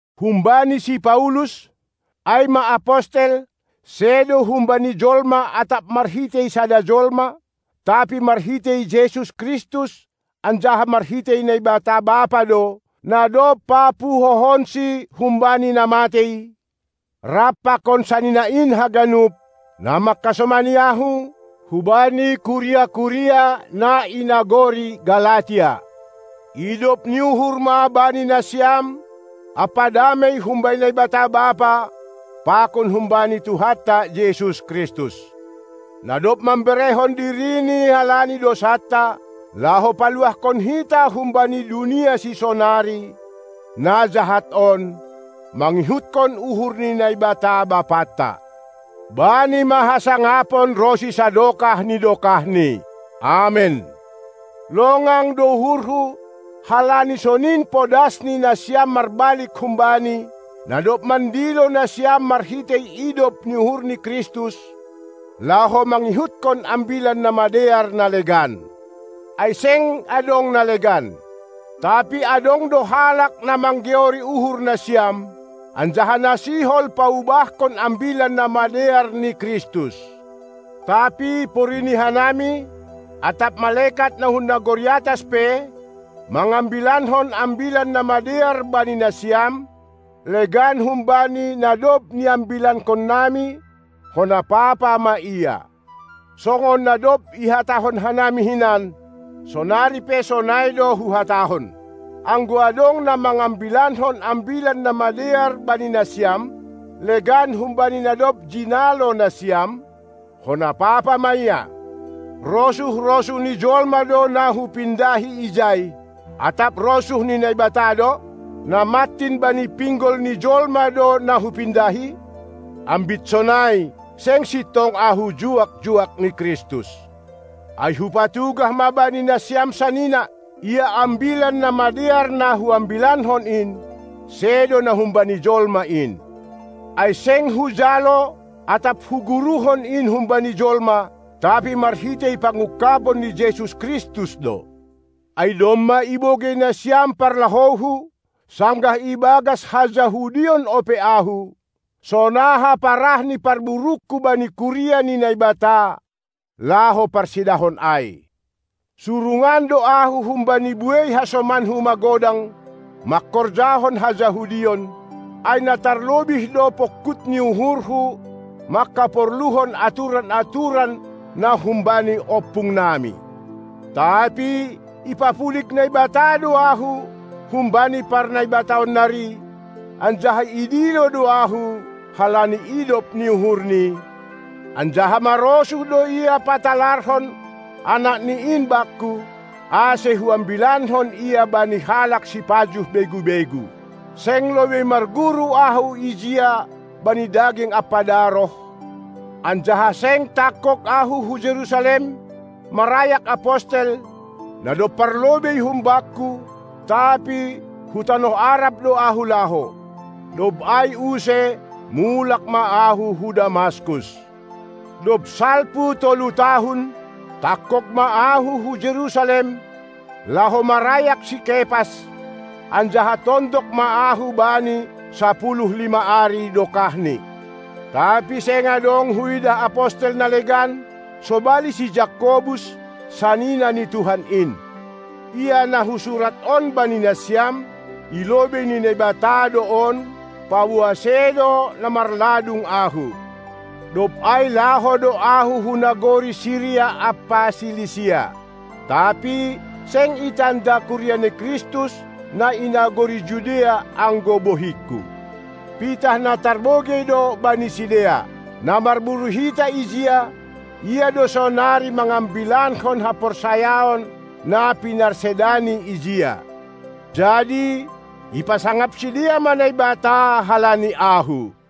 Humbani si Paulus, ai ma apostel, sedo humbani jolma atap marhitei sada jolma, tapi marhitei Jesus Kristus anjaha marhitei Naibata Bapa do, na dob papuhohonSi humbani na matei, rap pakon sanina in haganup, na mangkasomani ahu, hubani kuria-kuria na i nagori Galatia. Idop ni uhur ma bani nasiam ampa damei humbani Naibata Bapa pakon humbani Tuhanta Jesus Kristus, na dob mamberehon diriNi halani dousanta, laho paluahkon hita humbani dunia sisonari, na jahat on, mangihutkon uhur ni Naibata Bapanta. Bani ma hasangapon ronsi sadokah ni dokahni. Amen. Longang do uhurhu, halani sonin podasni nasiam marbalik hum-Bani, na dob mandilo nasiam marhitei idop ni uhur ni Kristus, laho mangihutkon Ambilan Namadear na legan, ai seng adong na legan. Tapi adong do halak na manggeori uhur nasiam, anjaha na sihol paubahkon Ambilan Namadear ni Kristus. Tapi porini hanami, atap malekat na hun nagori atas pe, mangambilankon Ambilan Namadear bani nasiam, legan humbani na dob niambilankonnami, hona papa ma ia. Songon na dob ihatahon hanami hinan, sonari pe sonai do huhatahon: Anggo adong na mangambilankon Ambilan Namadear bani nasiam, legan humbani na dob jinalo nasiam, hona papa ma ia. Rosuh-rosuh ni jolma do na hupindahi ijai, atap rosuh ni Naibata do? Na mantin bani pinggol ni jolma do na hupindahi? Ambit sonai, seng sintong ahu juak-juak ni Kristus. Ai hupatugah ma bani nasiam sanina, ia Ambilan Namadear na huambilankon in, sedo na humbani jolma in. Ai seng hujalo atap huguruhon in humbani jolma, tapi marhitei pangungkabon ni Jesus Kristus do. Ai domma ibogei nasiam parlahouhu, sanggah ibagas ha-Jahudion ope ahu, sonaha parahni parburungku bani kuria ni Naibata, laho parsedahon ai. Surungan do ahu humbani buei hasomanku magodang mangkorjahon ha-Jahudion, ai na tarlobih do pongkut ni uhurhu manghaporluhon aturan-aturan na humbani ompungnami. Tapi ipapulig Naibata do ahu, humbani parnaibataan nari, anjaha idilo do ahu halani idop ni uhurni, anjaha marosuh do Ia patalarhon Anakni in bakku, ase huambilankon Ia bani halak sipajuh begu-begu. Seng lobei marguru ahu ijia bani daging ampa daroh, anjaha seng tangkog ahu hu Jerusalem, marayak apostel, na dob parlobei humbakku; tapi hu tanoh Arab do ahu laho. Dob ai use mulak ma ahu hu Damaskus. Dob salpu tolu tahun, tangkog ma ahu hu Jerusalem, laho marayak si Kepas, anjaha tondok ma ahu bani sapuluh lima ari dokahni. Tapi seng adong huidah apostel na legan, sobali si Jakobus, sanina ni Tuhan in. Ia na husurat on bani nasiam, i lobei ni Naibata do on, paboa sedo na marladung ahu. Dob ai laho do ahu hu nagori Siria ampa Silisia. Tapi seng itanda kuria ni Kristus, na i nagori Judea, anggo bohingku. Pitah na tarbogei do bani sidea: "Na marburu hita ijia, ia do sonari mangambilankon haporsayaon, na pinarsedani ijia." Jadi ipasangap sidea ma Naibata halani ahu.